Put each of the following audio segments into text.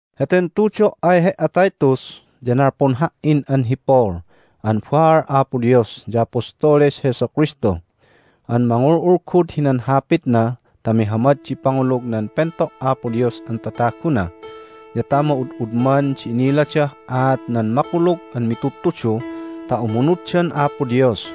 Heten tudo' ay he"a, Titus, ya nalpun ha"in an hi Paul an baal Apo Dios ya apostoles Jesu Kristu an mangul'ulgud hinan Hapitna ta mihamad di pangulug nan pento' Apo Dios an tataguna ya ta ma'ud'udman di iniladah aat nan Makulug an Mitudtudu ta umunuddan Apo Dios.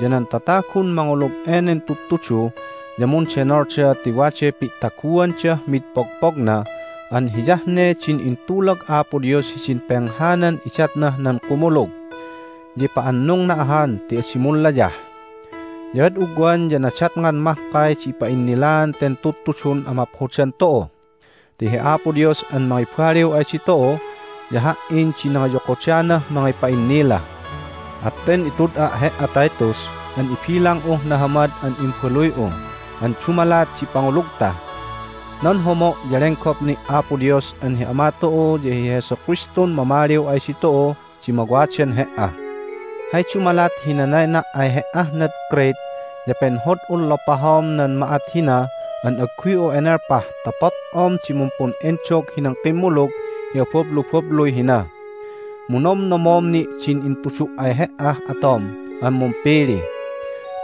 Ya nan tatagun mangulug enen tudtudu ya mundenolda ti waday pi'taguandah mid pogpogna an hiyah ne din intulag Apo Dios hidin penghanan idatnah nan kumulug. Ya ipa'annungna ahan ti adi munlayah. Ya ad ugwan ya nadatngan mahkay di ipa'innilaan ten Tudtudun amaphodan tu'u. Ti hi Apo Dios an mangibaliw ay ditu'u ya ha"in di nangiyokodanah mangipa'innila. At ten itud'a' he"a, Titus, an ibilang'uh nahamad an imbaluy'u an dumalat di pangulugta. Nan homo' ya lenggop ni' Apo Dios an hi Ama tu'u ya hi Jesu Kristun mamaliw ay ditu'u di mawadan he"a. Hay dumalat hi nanayna' ay he"ah nad Crete ya penhod'un lopahom nan ma'at hina an agguy'u enelpah ta pot'om di mumpun'endog hinan kimmulug hi abablubabluy hina. Mu nomnomom ni' din intudu' ay he"ah atom an mumpili.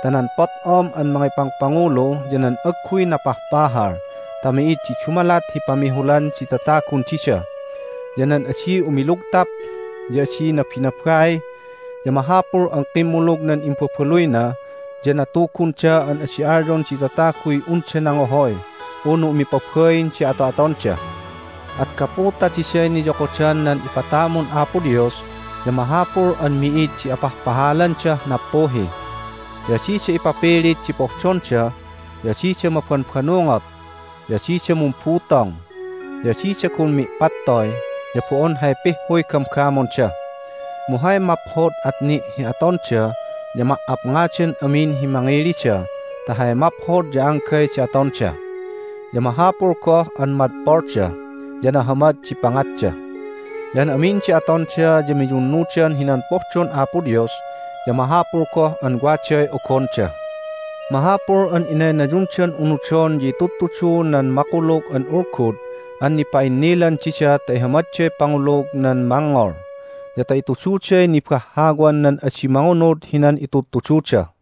Ta nan pot'om an mangipangpangulu ya nan agguy napahpahal ta mi'id di dumalat hi pamihulan di tatagun dida, ya nan adi umilugtap, ya adi nabinabai, ya mahapul an kimmulug nan imbabaluyna ya natugunda an adi alyon di tataguy unda nangohoy unu umipabain di ato'atonda. At gapu ta diday niyokodan nan ipatamun Apo Dios ya mahapul an mi'id di apahpahalandah nappuhi, ya adida ipapilit di pohdonda, ya adida mabanbanungot, ya adida mumbutong, ya adida gun mi'pattoy, ya bo'on hay pihhuy gamgamonda. Mu hay maphod at ni' hi atonda ya ma"apngadan amin hi mangilida ta hay maphod ya anggay di atonda. Ya mahapul goh an madpolda, ya nahamad di pangatda. Ya an amin di atonda ya miyunnudan hinan pohdon Apo Dios, ya mahapul goh an waday ogonda. Mahapul an inaynayundan unudon ya itudtudu nan Makulug an Ulgud an nipa'innilan dida ta ihamadday pangulug nan mangngol, ya ta itududay nibahhawan nan adi mangunud hinan itudtududa.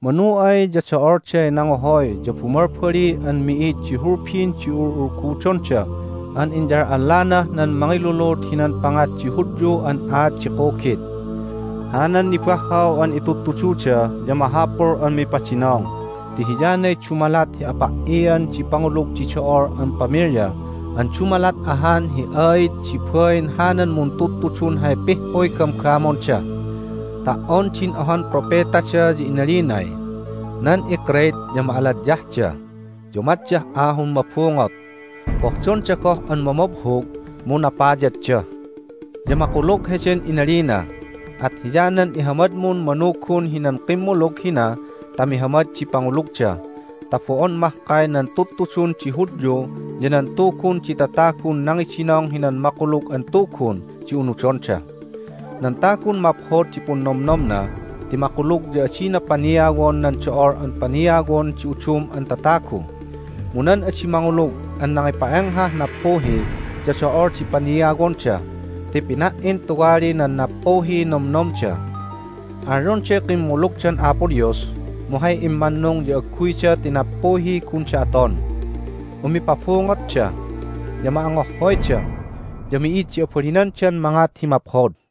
Manu ay ya do'olday nangohoy ya bumalbali an mi'id di hulbin di ul'ulgudonda an inyal'allanah nan mangilulud hinan pangat di Hudyu an aat di kugit. Hanan nibahhaw an itudtududa ya mahapul an mipadinong ti hiyanay dumalat hi apa"ian di pangulug di do'ol an pamilya an dumalat ahan hi aid di bain hanan muntudtudun hay pihhuy gamgamonda. Ta"on din ohan propetada ya inalinay, "Nan iCrete ya ma'aladyahda, ya umatdah ahun mabungot. Pohdonda goh an mamabhug, mu napayadda." Ya makulug heden inalina. At hiyanan ihamadmun manugun hinan kimmulug hina ta mihamad di pangulugda ta bo'on mahkay nan tudtudun di Hudyu ya nan tugun di tatagun nangidinong hinan Makulug an Tugun di unudonda. Nan tagun maphod di punnomnomna ti makulug ya adina paniawon nan do'ol an paniawon di udum an tatagu. Mu nan adi mangulug an nangipa'enghah nappuhi ya do'ol di paniawonda ti pina"in tuwali nan nappuhiy nomnomda. Alyonday kimmulugdan Apo Dios, mu hay immannung ya agguyda ti nappuhiy gunda aton. Umipabungotda, ya ma'angohhoyda, ya mi'id di abalinandan mangat hi maphod.